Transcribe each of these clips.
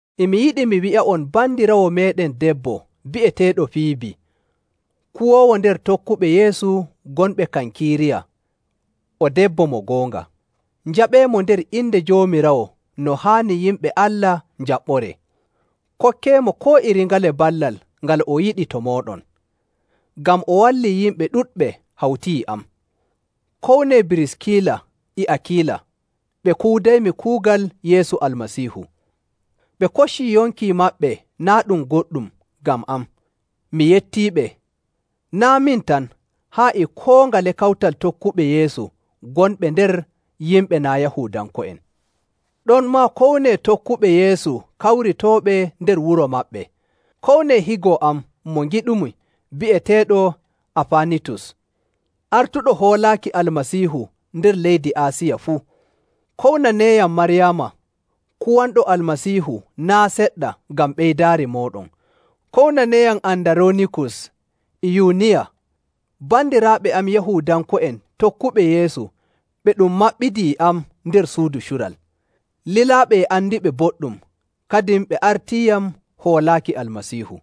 E mi yiɗi mi wi'a'on bandiraawo meeɗen debbo bi'eteeɗo Fiibi, kuwoowo nder tokkuɓe Yeesu gonɓe Kankiiriya, o debbo mo goonga. Njaɓɓeemo nder inde Joomiraawo no haani yimɓe Allah njaɓɓoree. Kokkeemo koo iri ngale ballal ngal o yiɗi to mooɗon, ngam o wallii yimɓe ɗuɗɓe hawti e am. Kownee Biriskila e Akiila, ɓe kuudaymi kuugal Yeesu Almasiihu. Ɓe koccii yonki maɓɓe naa' ɗum goɗɗum ngam am. Mi yettiiɓe, naa' min tan haa e koo ngale kawtal tokkuɓe Yeesu gonɓe nder yimɓe naa' Yahuudanko'en. Ɗonmaa kownee tokkuɓe Yeesu kawritooɓe nder wuro maɓɓe. Kownee higo am mo ngiɗumi bi'eteeɗo Afaanitus, artuɗo hoolaaki Almasiihu nder leydi Aasiya fuu. Kownaneeyam Maryaama, kuwanɗo Almasiihu naa' seɗɗa ngam ɓeydaari mooɗon. Kownaneeyam Andaroonikus e Yuuniya, bandiraaɓe am Yahuudanko'en tokkuɓe Yeesu ɓe ɗum maɓɓidi e am nder suudu cural. Lilaaɓe e andiɓe boɗɗum, kadin ɓe artiiyam hoolaaki Almasiihu.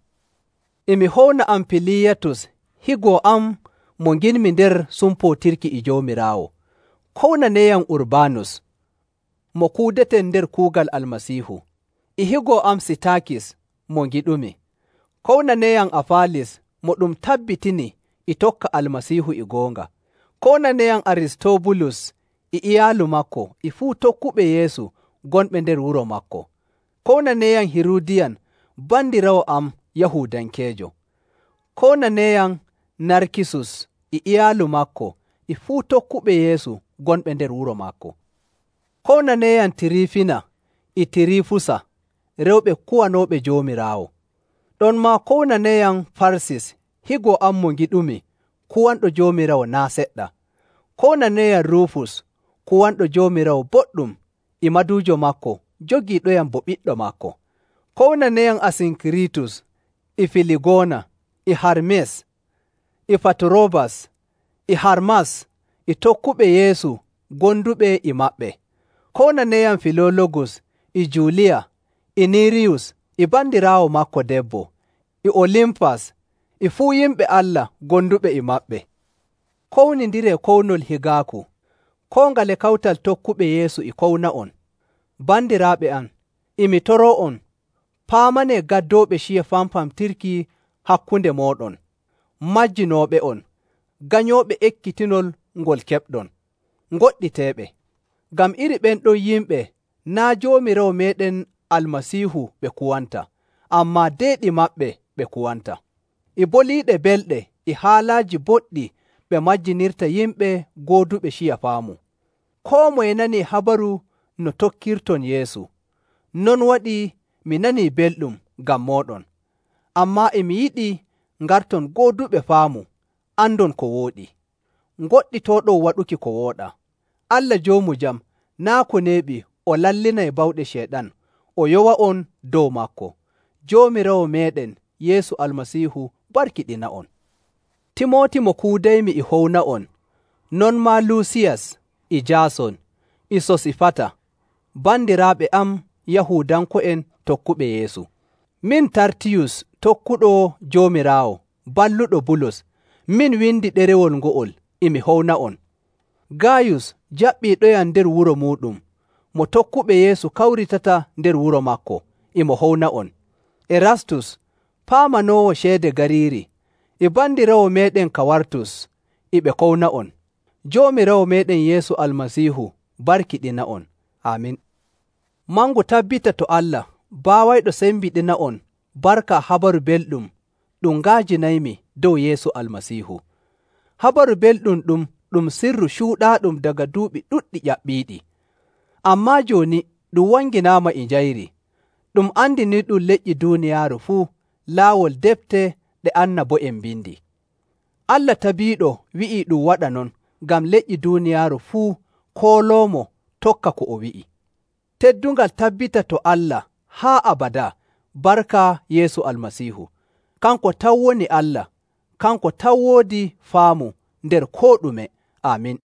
E mi howna Ampiliyaatus higo am mo ngiɗmi nder sumpootirki e Joomiraawo. Kownaneeyam Urbaanus, mo kuudeten nder kuugal Almasiihu, e higo am Sitaakis mo ngiɗumi. Kownaneeyam Afaalis, mo ɗum tabbitini e tokka Almasiihu e goonga. Kownaneeyam Aristobulus e iyaalu maako e fuu tokkuɓe Yeesu gonɓe nder wuro maako. Kownaneeyam Hiruudiyan bandiraawo am Yahuudankeejo. Kownaneeyam Narkisus e iyaalu maako e fuu tokkuɓe Yeesu gonɓe nder wuro maako. Kownaneeyam Tiriifina e Tiriifusa, rewɓe kuwanooɓe Joomiraawo. Ɗonmaa kownaneeyam Farsis higo am mo ngiɗumi kuwanɗo Joomiraawo naa' seɗɗa. Kownaneeyam Ruufus kuwanɗo Joomiraawo boɗɗum e maduujo maako jogiiɗoyam bo ɓiɗɗo maako. Kownaneeyam Asinkiriitus, e Filigoona, e Harmis, e Faturoobas, e Harmas e tokkuɓe Yeesu gonduɓe e maɓɓe. Kownaneeyam Filoologus, e Juuliya, e Niriyus e bandiraawo maako debbo, e Olimfas, e fuu yimɓe Allah gonduɓe e maɓɓe. Kownindiree kownol higaaku. Koo ngale kawtal tokkuɓe Yeesu e kowna'on. Bandiraaɓe am, e mi toroo'on, paamanee gaddooɓe ciya famfamtirki hakkunde mooɗon, majjinooɓe'on, ganyooɓe ekkitinol ngol keɓɗon. Ngoɗɗiteeɓe. Ngam iri ɓen ɗon yimɓe naa' Joomiraawo meeɗen Almasiihu ɓe kuwanta, ammaa deeɗi maɓɓe ɓe kuwanta. E boliiɗe belɗe e haalaaji boɗɗi ɓe majjinirta yimɓe gooduɓe ciya faamu. Koo moye nanii habaru no tokkirton Yeesu, non waɗii mi nanii belɗum ngam mooɗon. Ammaa e mi yiɗi ngarton gooduɓe faamu andon ko wooɗi, ngoɗɗitooɗon waɗuki ko wooɗaa. Allah joomu jam naa' ko neeɓi o lallinay bawɗe Ceyɗan o yowa'on dow maako. Joomiraawo meeɗen Yeesu Almasiihu barkiɗina'on. Timooti mo kuudaymi e howna'on, non maa Luusiyus, e Jaason, e Sosifata, bandiraaɓe am Yahuudanko'en tokkuɓe Yeesu. Min Tartiyus tokkuɗo Joomiraawo, balluɗo Bulus, min windi ɗerewol ngo'ol, e mi howna'on. Gaayus, jaɓɓiiɗoyam nder wuro muuɗum, mo tokkuɓe Yeesu kawritata nder wuro maako, e mo howna'on. Erastus, paamanoowo ceede gariiri, e bandiraawo meeɗen Kawartus, e ɓe kowna'on. [Joomiraawo meeɗen Yeesu Almasiihu barkiɗina'on. Aamin.] Mangu tabbita to Allah baawayɗo sembiɗina'on barka Habaru Belɗum ɗum nga'ajinaymi dow Yeesu Almasiihu. Habaru Belɗum ɗum ɗum sirru cuuɗaaɗum daga duuɓi ɗuɗɗi ƴaɓɓiiɗi. Ammaa jooni ɗum wanginaama e njayri, ɗum andiniiɗum leƴƴi duuniyaaru fuu laawol defte ɗe annabo'en mbindi. Allah tabiiɗo wi'ii ɗum waɗa non ngam leƴƴi duuniyaaru fuu kooloomo tokka ko o wi'i. Teddungal tabbita to Allah haa abadaa barka Yeesu Almasiihu! Kanko tan woni Allah. Kanko tan woodi faamu nder koo ɗume. Aamin.